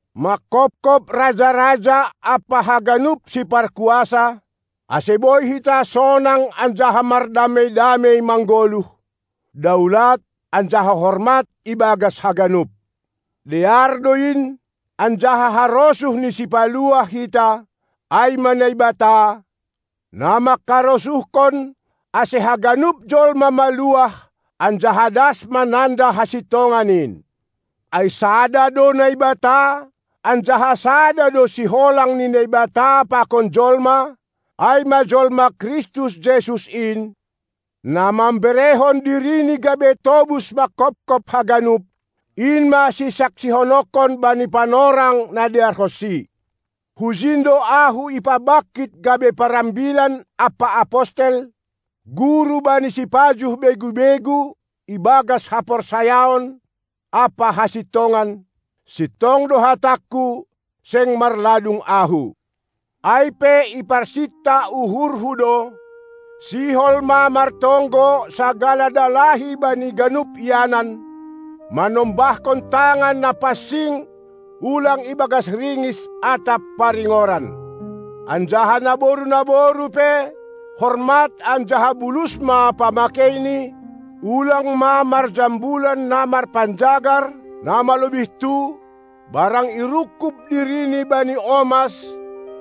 manghophop raja-raja ampa haganup siparkuasa, ase boi hita sonang anjaha mardamei-damei manggoluh, daulat anjaha hormat ibagas haganup. Dear do in, anjaha harosuh ni Sipaluah hita, ai ma Naibata, na mangkarosuhkon, ase haganup jolma maluah anjaha das mananda hasintongan in. Ai sada do Naibata, anjaha sada do siholang ni Naibata pakon jolma, ai ma jolma Kristus Jesus in, na mamberehon diriNi gabe tobus manghophop haganup; in ma sisaksihononkon bani panorang na dearhonsi. Hujin do ahu ipabangkit gabe parambilan ampa apostel, guru bani sipajuh begu-begu ibagas haporsayaon ampa hasintongan; sintong do hatangku, seng marladung ahu. Ai pe iparsinta uhurhu do, sihol ma martonggo sagala dalahi bani ganup ianan, manombahkon tangan na pansing, ulang ibagas ringis atap paringoran. Anjaha naboru-naboru pe, hormat anjaha bulus ma pamakeini, ulang ma marjambulan na marpanjagar na malobihtu, barang irungkub dirini bani omas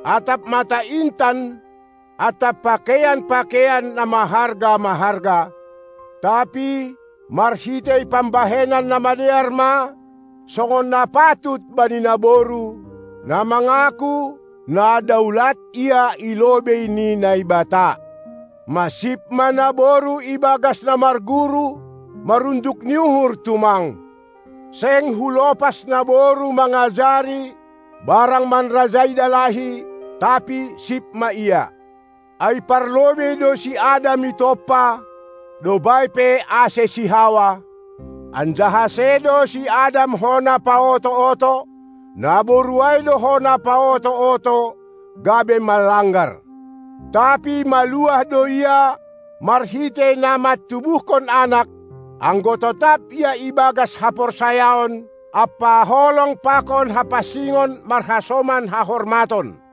atap mata intan atap pakeian-pakeian na maharga-maharga, tapi marhitei pambahenan na madear ma, songon na patut bani naboru, na mangaku, na daulat ia i lobei ni Naibata. Masip ma naboru ibagas na marguru, marunduk ni uhur tumang. Seng hulopas naboru mangajari barang manrajai dalahi, tapi sip ma ia. Ai parlobei do si Adam itompa, dob ai pe ase si Hawa; anjaha sedo si Adam hona paoto-oto; naboru ai do hona paoto-oto, gabe manlanggar. Tapi maluah do ia marhitei na mantubuhkon anak, anggo totap ia ibagas haporsayaon ampa holong pakon hapansingon marhasoman hahormaton.